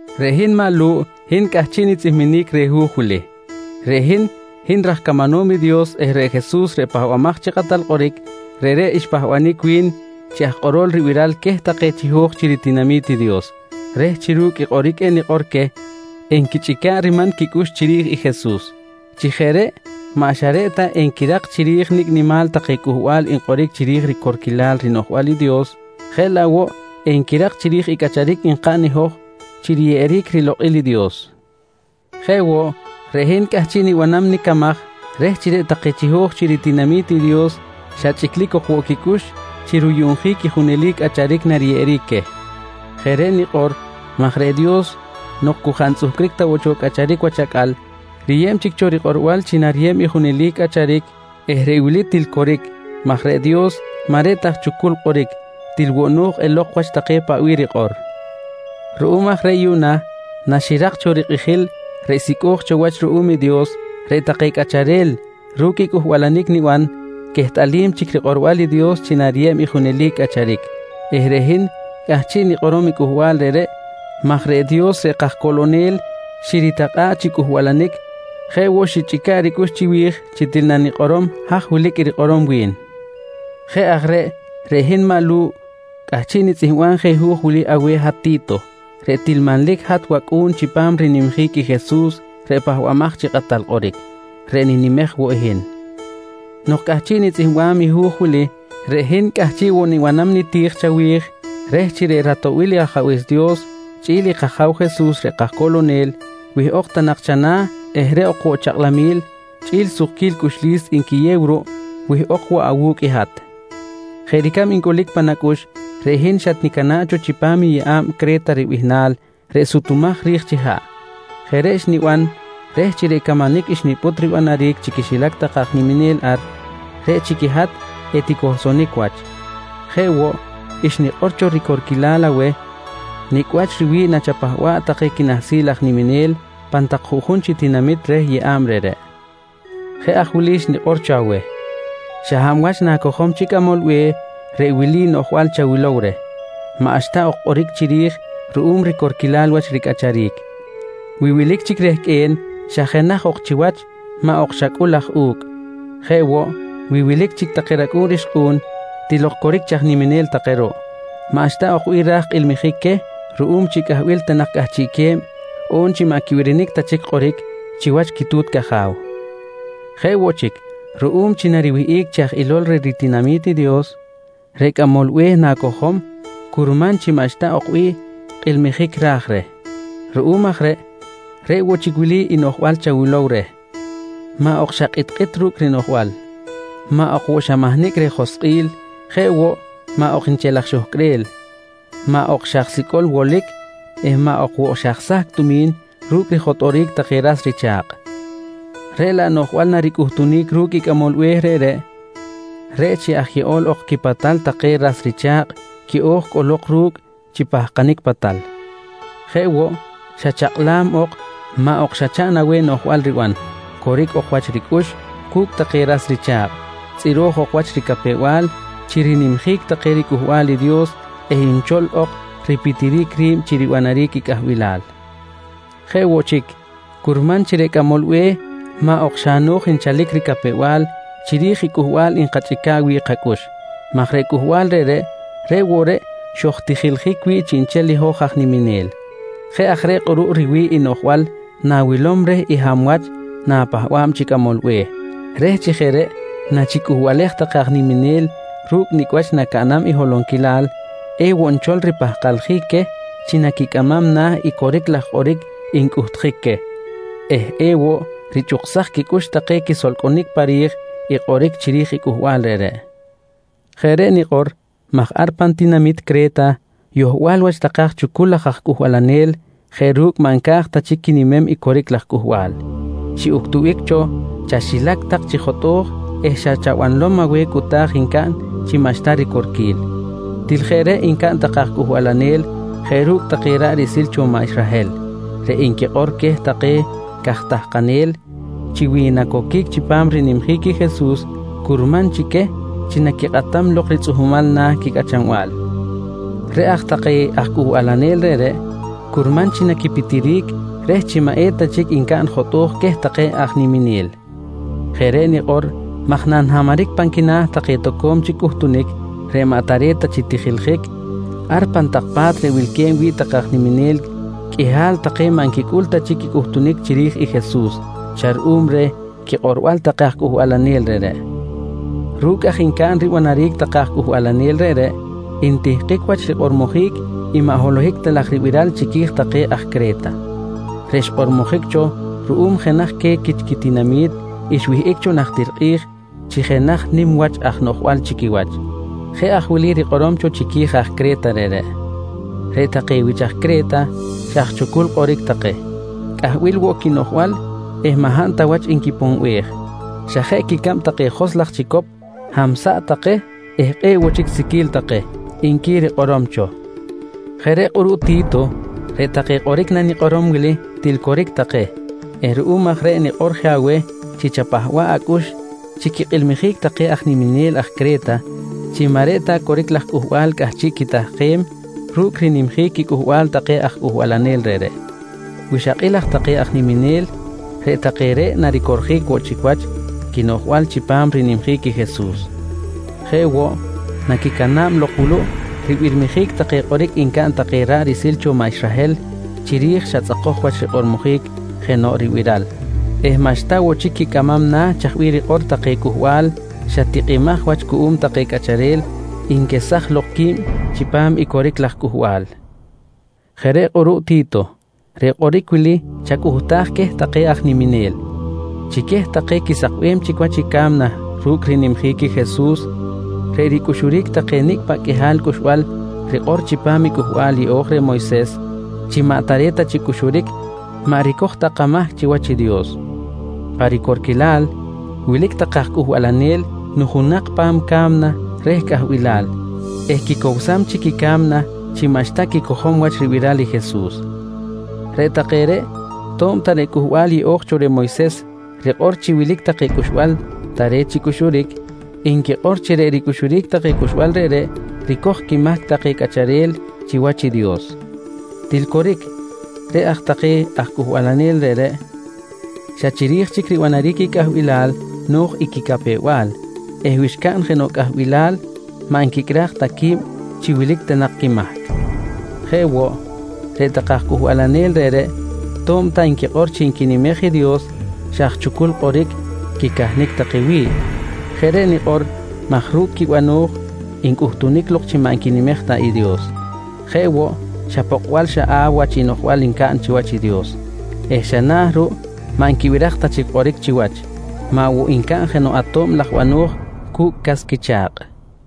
Reꞌ hin maꞌ Lu̱ꞌ, hin cꞌahchiꞌ nitzꞌihminic reh hu̱j wili. Reꞌ hin, hin raj camanom i Dios eh reꞌ Jesus reꞌ Pahbamaj chi Kꞌatal Kꞌoric, reꞌreꞌ xpahbanic wi̱n chi aj kꞌorol ribiral queh take chiho̱j chi ritinami̱t i Dios reh chi ru̱cꞌ i kꞌoric enikꞌor queh enquichꞌica̱ꞌ riman quicꞌux chiri̱j i Jesus. Chi jeꞌ reꞌ maꞌ xa reꞌ ta enquirak chiri̱j nicꞌ nimal take cꞌuhbal nkꞌoric chiri̱j ricorquilal rinoꞌjbal i Dios, jeꞌ laꞌ woꞌ enquirak chiri̱j i cꞌacharic nkaꞌn i hoj chi riyeꞌeric rilokꞌil i Dios. Jeꞌ woꞌ, reꞌ hin cꞌahchiꞌ nibanam nicamaj reh chi reꞌ take chiho̱j chi ritinami̱t i Dios xa chꞌiclic ok woꞌ quicꞌux chi ruyuꞌnjic i junelic cꞌacharic nariyeꞌeric queh. Jeꞌ reꞌ nikꞌor maj reꞌ Dios nok cu jaꞌ ntzꞌuhcric ta cho cꞌacharic wach acꞌal, riyeb chic cho rikꞌorbal chi nariyeb i junelic cꞌacharic eh reꞌ wili til coric, maj reꞌ Dios maꞌ reꞌ ta aj chucul kꞌoric, til woꞌ no̱j elok wach take paꞌ bih rikꞌor. Ruꞌum aj reꞌ yuꞌna naxirak cho rikꞌijil reꞌ sicꞌo̱j cho wach ruꞌum i Dios, reꞌ take cꞌacharel ru̱cꞌ i cꞌuhbalanic niban quehtꞌalim chic rikꞌorbal i Dios chi nariyeb i junelic cꞌacharic eh reꞌ hin cꞌahchiꞌ nikꞌorom i cꞌuhbal reꞌreꞌ maj reꞌ Dios reꞌ kajcoꞌlonel xiritakꞌa̱ꞌ chi cꞌuhbalanic, jeꞌ woꞌ xichꞌica̱ꞌ ricꞌux chiwi̱j til chi nanikꞌorom haj wilic i rikꞌorom wi̱n. Jeꞌ aj reꞌ, reꞌ hin maꞌ Lu̱ꞌ cꞌahchiꞌ nitzꞌihmbam je hu̱j wili aweh hat Ti̱to reꞌ til manlic hat wacꞌu̱n chipam rinimjic i Jesus reꞌ Pahbamaj chi Kꞌatal Kꞌoric reꞌ ninimej woꞌ i hin. Nok cꞌahchiꞌ nitzꞌihmbam i hu̱j wili, reꞌ hin cꞌahchiꞌ woꞌ nibanam niti̱j chawi̱j reh chi reꞌ ratoꞌbil i Ajabe̱s Dios chꞌi̱l i kAja̱w Jesus reꞌ kajcoꞌlonel, wihꞌok ta nak chana̱ eh reꞌ ok woꞌ chakꞌlamil chꞌi̱l sukquil cꞌuxlis nquiyew ruꞌ wihꞌok woꞌ awu̱cꞌ i hat. Jeꞌ ricab ncꞌulic pan acꞌux, reꞌ hin xatnicana̱ꞌ cho chipam yeꞌa̱b Cre̱ta ribihnal reꞌ sutumaj ri̱j chi haꞌ. Jeꞌ reꞌ xniban reh chi reꞌ camanic xnipꞌut ribanaric chi quixilac take aj niminel ar, reꞌ chic i hat eticohlsonic wach. Jeꞌ woꞌ, xnikꞌor cho ricorquilal aweh nicꞌ wach riwi̱ꞌ nachapahba̱ꞌ take quinahsil aj niminel pan tak juꞌjun chi tinamit reh yeꞌa̱b reꞌreꞌ. Jeꞌ aj wili xnikꞌor cho aweh: Xa hab wach na̱cojom chi cꞌamol be̱h reꞌ wili noꞌjbal chawilow reh: Maꞌxta ok kꞌoric chiri̱j ruꞌum ricorquilal wach ricꞌacharic. Wi wilic chic rehqꞌue̱n, xa jenaj ok chiwach maꞌ ok xa cꞌul aj u̱cꞌ. Jeꞌ woꞌ, wi wilic chic take racꞌu̱n rixkꞌu̱n, til ok coric chi aj niminel take ruꞌ, maꞌxta ok bih raj kilmijic queh ruꞌum chi cꞌahbilal ta nak cꞌahchiꞌque̱b, on chi maꞌ quibirinic ta chic kꞌoric chiwach quitu̱t caja̱w. Jeꞌ woꞌ chic, ruꞌum chi nariwihꞌic chi aj ilol reh ritinami̱t i Dios, reꞌ cꞌamol be̱h na̱cojom curman chi maꞌxta ok bih kilmijic raj reh. Ruꞌum aj reꞌ, reꞌ woꞌ chic wili i noꞌjbal chawilow reh: Maꞌ ok xa kꞌitkꞌit ru̱cꞌ rinoꞌjbal. Maꞌ ok woꞌ xa mahnicꞌ reh joskꞌil. Jeꞌ woꞌ, maꞌ ok nchel aj xohcꞌrel, maꞌ ok xa aj sicꞌol wolic eh maꞌ ok woꞌ xa aj sahcꞌ tumi̱n ru̱cꞌ rijotꞌoric take ras richa̱kꞌ. Reꞌ laꞌ noꞌjbal naricꞌuhtunic ru̱cꞌ i cꞌamol be̱h reꞌreꞌ, reꞌ chi aj yeꞌol ok quipatal take ras richa̱kꞌ quiꞌo̱j cꞌolok ru̱cꞌ chi pahkanic patal. Jeꞌ woꞌ, xa chakꞌlam ok, maꞌ ok xa chaꞌn aweh noꞌjbal riban, coric ok wach ricꞌux cu̱cꞌ take ras richa̱kꞌ, tzꞌiro̱j ok wach ricapew-bal chi rinimjic take riCꞌuhbal i Dios eh nchol ok ripitjic ri̱b chi ribanaric i cꞌahbilal. Jeꞌ woꞌ chic, curman woꞌ chi reꞌ cꞌamol be̱h maꞌ ok xa no̱j nchalic ricapew-bal chiri̱j i cꞌuhbal nkachꞌica̱ꞌ wi̱ꞌ kacꞌux maj reꞌ cꞌuhbal reꞌreꞌ, reꞌ woꞌ reꞌ xojtijiljic wi̱ꞌ chiꞌnchel i hoj aj niminel. Jeꞌ aj reꞌ kꞌuruꞌ riwi̱ꞌ i noꞌjbal na̱wilom reh i hab wach na̱pahba̱b chi cꞌamol be̱h, reh chi jeꞌ reꞌ nachicꞌuhbalej take aj niminel ru̱cꞌ nicꞌ wach nacaꞌn i holonquilal, ewoꞌ nchol ripahkaljic queh chi naquicꞌamam na̱ i coric laj kꞌoric ncꞌuhtjic queh eh ewoꞌ richꞌuksaj quicꞌux take quisolcꞌonic pa ri̱j i kꞌoric chiri̱j i cꞌuhbal reꞌreꞌ. Jeꞌ reꞌ nikꞌor maj ar pan tinamit Cre̱ta yohbal wach take aj chucul laj cꞌuhbalanel jeꞌ ru̱cꞌ maꞌ nca̱j ta chic quinimem i coric laj cꞌuhbal, xiꞌuctubic cho chaxilac tak chi jotꞌo̱j eh xa chabanlom aweh cꞌuta̱j ncaꞌn chi xa maꞌxta ricorquil. Til jeꞌ reꞌ ncaꞌn take aj cꞌuhbalanel jeꞌ ru̱cꞌ take ra̱ꞌ riꞌsil cho maꞌ Israhel reꞌ nquikꞌor queh take caj tahkanel chi wi nacoquic chipam rinimjic i Jesus, curman chi queh chi naquikꞌatam lok ritzꞌuhmal na̱ quicꞌachanbal. Reꞌ aj take aj cꞌuhbalanel reꞌreꞌ, curman chi naquipitiric reh chi maꞌ eta chic ncaꞌn jotꞌo̱j queh take aj niminel. Jeꞌ reꞌ nikꞌor maj nanhamaric pan quina̱ take toco̱m chic cꞌuhtunic reꞌ maꞌ tare̱t ta chi tijiljic, ar pan tak pa̱t reꞌ wilque̱b wi̱ꞌ take aj niminel qꞌuihal take maꞌ nquicꞌul ta chic i cꞌuhtunic chiri̱j i Jesus xa ruꞌum reh quikꞌorbal take aj cꞌuhbalanel reꞌreꞌ. Ru̱cꞌ ncaꞌn ribanaric take aj cꞌuhbalanel reꞌreꞌ, ntihkic wach rikꞌormojic i maꞌ holohic ta laj ribiral chiqui̱j take aj Cre̱ta, reꞌ xkꞌormojic cho ruꞌum jenaj queh quich quitinami̱t xwihꞌic cho najtir kꞌi̱j chi jenaj nim wach aj noꞌjbal chi quiwach. Jeꞌ aj wili rikꞌorom cho chiqui̱j aj Cre̱ta reꞌreꞌ: “Reꞌ take wich aj Cre̱ta, xa aj chucul kꞌoric take. Cꞌahbil woꞌ quinoꞌjbal eh maꞌ hab ta wach nquiponbej. Xa jeꞌ quicab take joskꞌ laj chicop, hamsaꞌ take eh kꞌe̱ꞌ woꞌ chic siqui̱l take, nqui rikꞌorom cho. Jeꞌ reꞌ kꞌuruꞌ Ti̱to reꞌ take kꞌoric nanikꞌorom wili til coric take eh ruꞌum aj reꞌ nikꞌor je aweh chi chapahba̱ꞌ acꞌux chi quikꞌilmijic take aj niminel ar Cre̱ta chi maꞌ reꞌ ta coric laj cꞌuhbal cꞌahchiꞌ quitahkem ru̱cꞌ rinimjic quicꞌuhbal take aj cꞌuhbalanel reꞌreꞌ. Wi xakꞌil aj take aj niminel, reꞌ take reꞌ naricorjic woꞌ chic wach quinoꞌjbal chipam rinimjic i Jesus. Jeꞌ woꞌ, naquicana̱b lok wuluꞌ ribirmijic take kꞌoric ncaꞌn take ra̱ꞌ riꞌsil cho maꞌ Israhel chiri̱j xa tzꞌakoj wach rikꞌormojic jenoꞌ ribiral eh maꞌxta woꞌ chic quicꞌamam na̱ chaj bih rikꞌor take cꞌuhbal xa tikꞌimaj wach cuꞌum take cꞌacharel nquesaj lok qui̱b chipam i coric laj cꞌuhbal. Jeꞌ reꞌ kꞌuruꞌ Ti̱to, reꞌ kꞌoric wili chacꞌuhtaj queh take aj niminel: Chi queh take quisakbem chic wach i ca̱mna ru̱cꞌ rinimjic i Jesus, reꞌ ricꞌuxuric take nicꞌ paꞌ qꞌuihal cꞌuxbal rikꞌor chipam i Cꞌuhbal Yeꞌo̱j cho reh i Moyses chi maꞌ tare̱t ta chi cꞌuxuric, maꞌ ricoj ta kamahc chiwach i Dios. Pa ricorquilal, wilic take aj cꞌuhbalanel nujunak pan ca̱mna reh cꞌahbilal eh quicowsam chic i ca̱mna chi maꞌxta quicojom wach ribiral i Jesus. Reꞌ take reꞌ, to̱b ta reꞌ Cꞌuhbal Yeꞌo̱j cho reh Moyses rikꞌor chi wilic take cꞌuxbal tare̱t chi cꞌuxuric, nquikꞌor chi reꞌ ricꞌuxuric take cꞌuxbal reꞌreꞌ ricoj quimahc take cꞌacharel chiwach i Dios. Til coric, reꞌ take aj cꞌuhbalanel reꞌreꞌ xa chiri̱j chic ribanaric i cꞌahbilal no̱j i quicapew-bal eh wi xcaꞌn jenoꞌ cꞌahbilal maꞌ nquicꞌraj ta qui̱b chi wilic ta nak quimahc. Jeꞌ woꞌ, reꞌ take aj cꞌuhbalanel reꞌreꞌ to̱b ta nquikꞌor chi nquinimej i Dios, xa aj chucul kꞌoric quicahnic take wi̱ꞌ. Jeꞌ reꞌ nikꞌor maj ru̱cꞌ quibano̱j ncꞌuhtunic lok chi maꞌ nquinimej ta i Dios. Jeꞌ woꞌ, xa pokꞌbal xaꞌaw wach i noꞌjbal ncaꞌn chiwach i Dios eh xa na ruꞌ maꞌ nquibiraj ta chic kꞌoric chiwach, maꞌ woꞌ ncaꞌn jenoꞌ ato̱b laj bano̱j cu̱cꞌ cas quicha̱kꞌ.